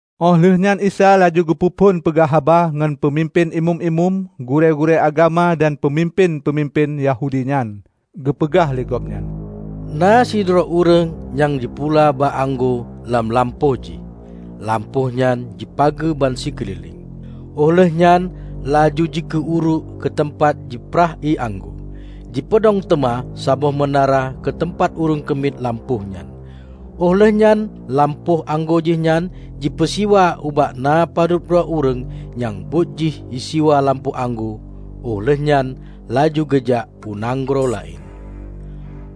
Óh lheueh nyan Isa laju geupeu phon peugah haba ngon peumimpén imeum-imeum, gurée-gurée agama dan peumimpén-peumimpén Yahudi nyan. Geupeugah lé Gobnyan, "Na sidroe ureuëng nyang jipula bak anggô lam lampôh jih, lampôh nyan jipageue bansikeulileng. Óh lheueh nyan laju jikueh uruek keuteumpat jiprah ié anggô, jipeudong teuma saboh meunara keuteumpat ureuëng keumiet lampôh nyan. Óh lheueh nyan lampôh anggô jihnyan jipeusiwa ubak na padub droe ureuëng nyang buet jih jisiwa lampôh anggô óh lheueh nyan laju geujak u nanggroe laén.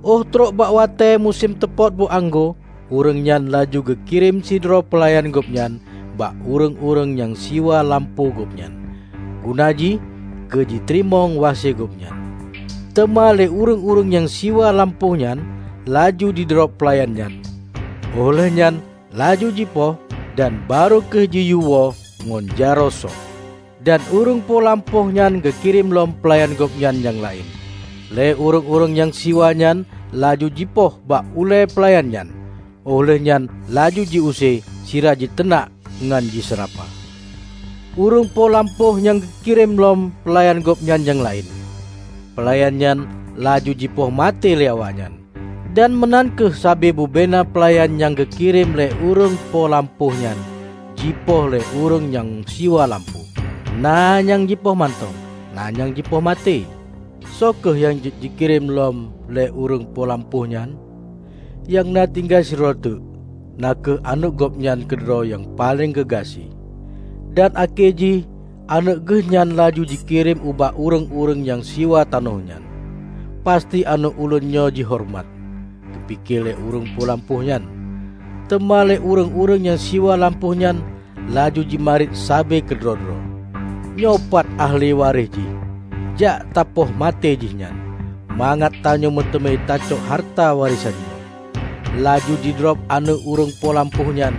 Óh trok bak watée musém teupot boh anggô, ureuëng nyan laju geukirém sidroe peulayan gobnyan ubak ureuëng-ureuëng nyang siwa lampôh gobnyan, guna jih keu jiteurimong wase gobnyan. Teuma lé ureuëng-ureuëng nyang siwa lampôh nyan laju jidrob peulayan nyan. Óh lheueh nyan laju jipoh dan barô kheueh jiyue woe ngon jaroe söh. Dan ureuëng po lampôh nyan geukirém lom peulayan gobnyan nyang laén. Lé ureuëng-ureuëng nyang siwa nyan laju jipoh bak ulée peulayan nyan, óh lheueh nyan laju jiuse sira jiteunak ngon jiseurapa. Ureuëng po lampôh nyang jikirém lom peulayan gobnyan nyang laén. Peulayan nyan laju jipoh maté lé awaknyan. Dan meunan kheueh sabe bubena peulayan nyang geukirém lé ureuëng po lampôh nyan jipoh lé ureuëng nyang siwa lampôh, na nyang jipoh mantong, na nyang jipoh maté. Soe kheueh nyang jeuet jikirém lom lé ureuëng po lampôh nyan? Nyang na tinggai sidroe teuk, na kheueh aneuëk gobnyan keudroe nyang paleng geugaséh. Dan akhé jih aneuëk geuh nyan laju geukirém ubak ureuëng-ureuëng nyang siwa tanoh nyan. 'Pasti aneuëk ulôn nyoe jihoreumat,' geupike lé ureuëng po lampôh nyan. Teuma lé ureuëng-ureuëng nyang siwa lampôh nyan laju jimarit sabe keudroe-droe, 'Nyoe pat ahli waréh jih. Jak tapoh maté jihnyan, mangat tanyoe meuteumé tacok hareuta warésan nyoe!' Laju jidrob aneuëk ureuëng po lampôh nyan,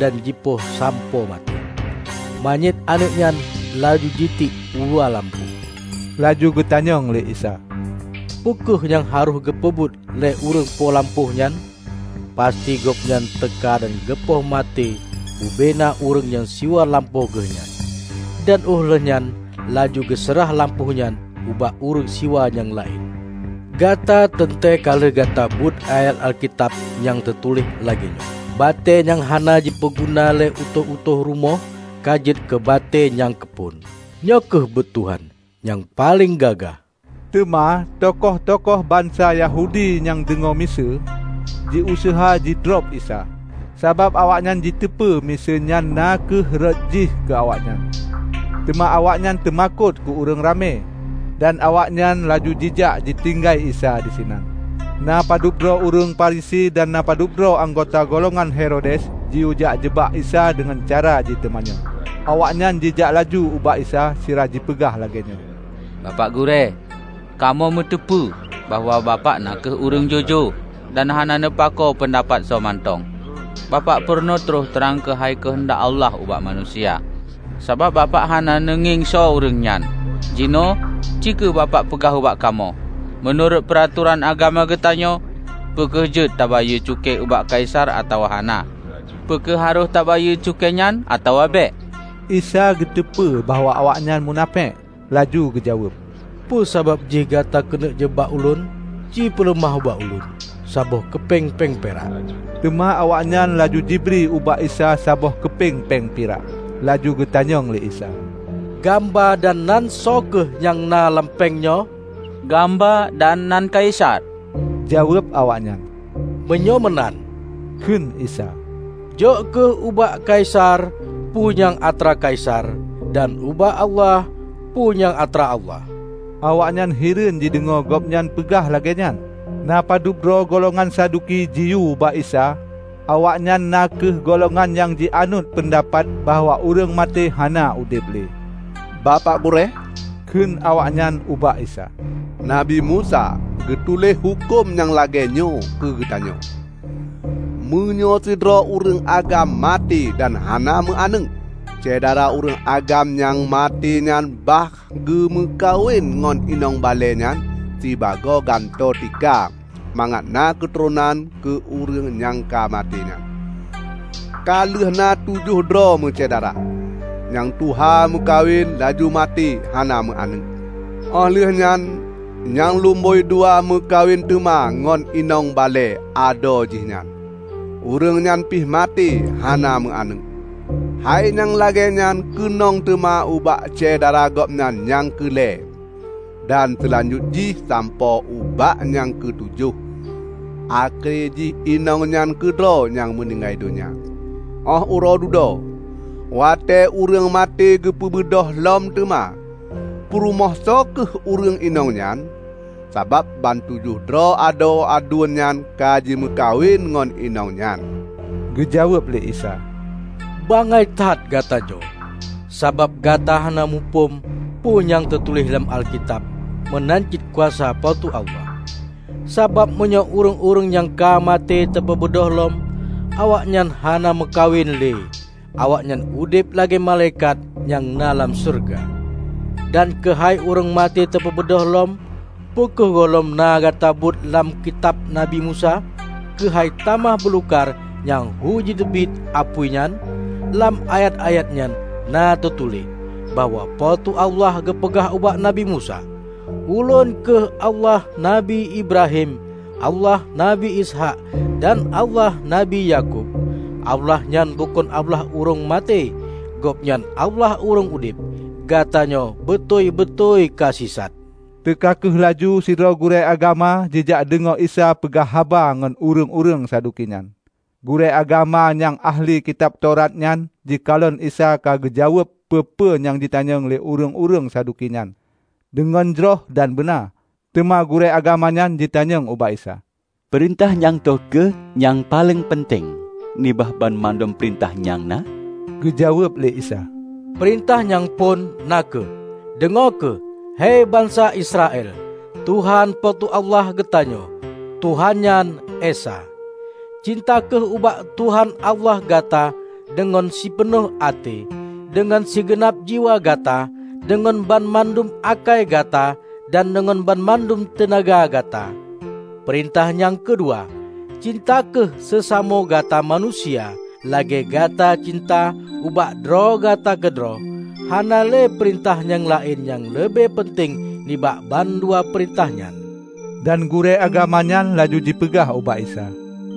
dan jipoh sampoe maté. Manyét aneuëk nyan laju jitiek uluwa lampôh." Laju geutanyong lé Isa, "Peu kheueh nyang harôh geupeubuet lé ureuëng po lampôh nyan? Pasti gobnyan teuka dan geupoh maté bubena ureuëng nyang siwa lampôh geuh nyan, dan óh lheueh nyan laju geuseurah lampôh nyan ubak ureuëng siwa nyang laén. Gata teuntée ka lheueh gata beuet ayat Alkitab nyang teutuléh lagée nyoe, 'Batée nyang hana jipeuguna lé utôh-utôh rumoh ka jeuet keu batée nyang keuphon. Nyoe kheueh buet Tuhan; nyang paleng gagah!' " Teuma tukoh-tukoh bansa Yahudi nyang deungoe miseue, jiuseuha jidrob Isa, sabab awaknyan jiteupeu miseue nyan na kheueh rhot jih keu awaknyan. Teuma awaknyan teumakot keu ureuëng ramé. Dan awaknyan laju jijak jitinggai Isa disinan. Na padub droe ureuëng Farisi dan na padub droe anggota golongan Herodes jiyue jak jeubak Isa deungon cara jiteumanyong. Awaknyan jijak laju ubak Isa sira jipeugah lagée nyoe, "Bapak Gurée, kamoe meuteupeue bahwa bapak na kheueh ureuëng jujoe dan hana neupakoe peundapat soe mantong. Bapak purunoe troh trang keuhai keuheundak Allah ubak manusia, sabab Bapak hana neungieng soe ureuëng nyan. Jinoe, ci kheueh Bapak peugah ubak kamoe, 'Meunurot peuratoran agama geutanyoe, peu kheueh jeuet tabayeue cukée ubak Kaisar atawa hana? Peu kheueh harôh tabayeue cukée nyan atawa bék?' " Isa geuteupeue bahwa awaknyan munafék. Laju geujaweueb, "Peue sabab jih gata keuneuk jeubak ulôn? Cipeuleumah ubak ulôn saboh keupeng péng pirak." Teuma awaknyan laju jibri ubak Isa saboh keupeng péng pirak. Laju geutanyong lé Isa, "Gamba dan nan soe kheueh nyang na lam péng nyoe?" "Gamba dan nan Kaisar," jaweueb awaknyan. "Meunyoe meunan," kheun Isa, "jok kheueh ubak Kaisar peue nyang atra Kaisar, dan ubak Allah peue nyang atra Allah." Awaknyan hireuen jideungoe gobnyan peugah lagée nyan. Na padub droe golongan Saduki ji ubak Isa (Awaknyan na kheueh golongan nyang jianut peundapat bahwa ureuëng maté hana udeb le.) "Bapak Gurée," kheun awaknyan ubak Isa, "Nabi Musa geutuléh huköm nyang lagée nyoe keu geutanyoe: 'Meunyoe sidroe ureuëng agam maté dan hana meu aneuëk, syedara ureuëng agam nyang maté nyan bah geumeukawen ngon inong balée nyan sibagoe gantoe tika mangat na keuturonan keu ureuëng nyang ka maté nyan.' Ka lheueh na tujoh droe meusyedara, nyang tuha meukawen laju maté hana meu aneuëk. Óh lheueh nyan nyang lomboi dua meukawen teuma ngon inong balée adue jih nyan, ureuëng nyan pih maté hana meu aneuëk. Hai nyang lagée nyan keunong teuma ubak syedara gobnyan nyang keu lhée, dan seulanjut jih sampoe ubak nyang keutujoh. Akhé jih inong nyan keudroe nyang meuninggai donya. Óh uroe dudoe, watée ureuëng maté geupeubeudôh lom teuma, peurumoh soe kheueh ureuëng inong nyan? Sabab bantujoh droe adoe aduen nyan ka jimeukawen ngon inong nyan!" Geujaweueb lé Isa, "Bangai that gata nyoe. Sabab gata hana muphom peue nyang teutuléh lam Alkitab meunan cit kuasa Po teu Allah. Sabab meunyoe ureuëng-ureuëng nyang ka maté teupeubeudôh lom, awaknyan hana meukawen le, awaknyan udeb lagée malaikat nyang na lam syeuruga. Dan keuhai ureuëng maté teupeubeudôh lom, peu kheueh gohlom na gata beuet lam kitab Nabi Musa keuhai tamah beulukar nyang hu jiteubiet apui nyan? Lam ayat-ayat nyan na teutuléh bahwa Po teu Allah geupeugah ubak Nabi Musa, 'Ulôn kheueh Allah Nabi Ibrahim, Allah Nabi Ishaq dan Allah Nabi Yakub.' Allah nyan bukon Allah ureuëng maté. Gobnyan Allah ureuëng udeb. Gata nyoe beutôi-beutôi ka sisat!" Teuka kheueh laju sidroe gurée agama jijak deungoe Isa peugah haba ngon ureuëng-ureuëng Saduki nyan. Gurée agama nyang ahli kitab Taurat nyan jikalon Isa ka geujaweueb peue-peue nyang jitanyong lé ureuëng-ureuëng Saduki nyan deungon jroh dan beuna. Teuma gurée agama nyan jitanyong ubak Isa, "Peurintah nyang toh kheueh nyang paleng peunteng nibak banmandum peurintah nyang na?" Geujaweueb lé Isa, "Peurintah nyang phon, na kheueh: 'Deungoe kheueh, hei bansa Israel! Tuhan Po teu Allah geutanyoe, Tuhan nyan Esa. Cinta kheueh ubak Tuhan Allah gata deungon sipeunoh até, deungon sigeunab jiwa gata, deungon banmandum akai gata dan deungon banmandum teunaga gata.' Peurintah nyang keudua: 'Cinta kheueh seusamoe gata manusia, lagée gata cinta ubak droe gata keudroe.' Hana le peurintah nyang laén nyang leubeh peunteng nibak ban dua peurintah nyan." Dan gurée agama nyan laju jipeugah ubak Isa,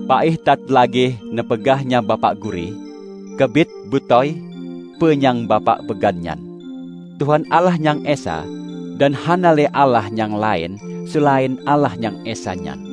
"Paih that lagée neupeugah nyan Bapak Gurée! Keubiet beutôi peu nyang Bapak peugah nyan: Tuhan Allah Nyang Esa, dan hana le Allah nyang laén seulaén Allah Nyang Esa nyan.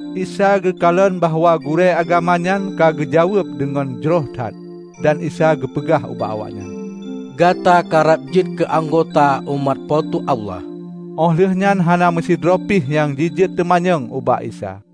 Isa geukalon bahwa gurée agamanyan ka geujaweueb deungon jroh that. Dan Isa geupeugah ubak awaknyan, "Gata karab jeuet keu anggota umat Po teu Allah." Óh lheuehnyan hana meusidroe pih nyang jijeuet teumanyong ubak Isa.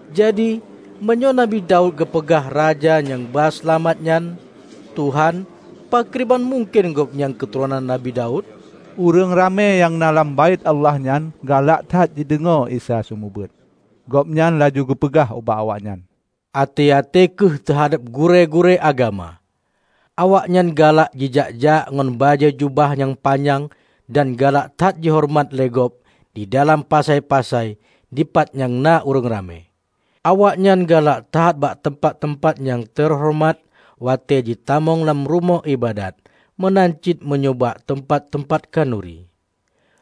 Jadi, meunyoe Nabi Daud geupeugah Raja nyang ba Seulamat nyan 'Tuhan' pakriban mungken Gobnyan keuturonan Nabi Daud?" Ureuëng ramé nyang na lam Baét Allah nyan galak that jideungoe Isa seumeubeuet. Gobnyan laju geupeugah ubak awaknyan, "Até-até kheueh teuhadab gurée-gurée agama. Awaknyan galak jijak-jak ngon bajée jubah nyang panyang dan galak that jihoreumat lé gob di dalam pasai-pasai dipat nyang na ureuëng ramé. Awaknyan galak that bak teumpat-teumpat nyang teuhoreumat watée jitamong lam rumoh iébadat meunan cit meunyoe bak teumpat-teumpat khanuri.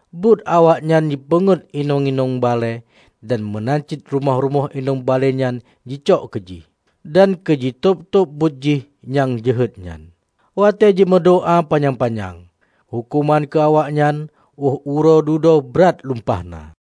Buet awaknyan jipeungét inong-inong balée dan meunan cit rumoh-rumoh inong balée nyan jicok keujih. Dan keu jitôb-tôb buet jih nyang jeuhet nyan, watée jimeudoá panyang-panyang. Huköman keu awaknyan óh uroe dudoe brat lumpah na!"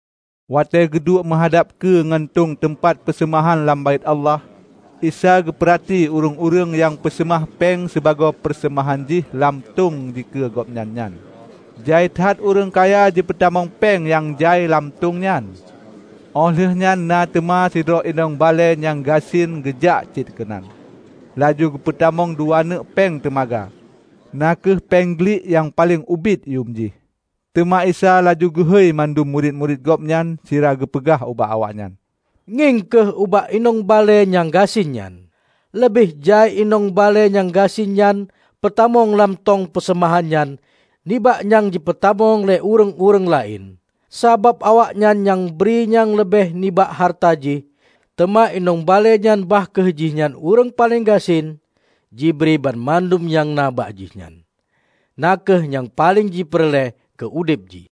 Watée geuduek meuhadab keue ngon tông teumpat peuseumahan lam Baét Allah, Isa geupeurati ureuëng-ureuëng nyang peuseumah péng sibagoe peuseumahan jih lam tông dikeue gobnyan nyan. Jai that ureuëng kaya jipeutamong péng nyang jai lam tông nyan; Óh lheueh nyan na teuma sidroe inong balée nyang gasien geujak cit keunan. Laju geupeutamong dua neuk péng teumaga, na kheueh péng glik nyang paleng ubit yuem jih. Teuma Isa laju geuhôi mandum murit-murit Gobnyan sira geupeugah ubak awaknyan, "Ngieng kheueh ubak inong balée nyang gasien nyan: Leubeh jai inong balée nyang gasien nyan peutamong lam tông peuseumahan nyan nibak nyang jipeutamong lé ureuëng-ureuëng laén. Sabab awaknyan nyang jibri nyang leubeh nibak hareuta jih. Teuma inong balée nyan bah kheueh jih nyan ureuëng paleng gasien jibri banmandum nyang na bak jihnyan -- na kheueh nyang paleng jipeureulée keu udeb jih."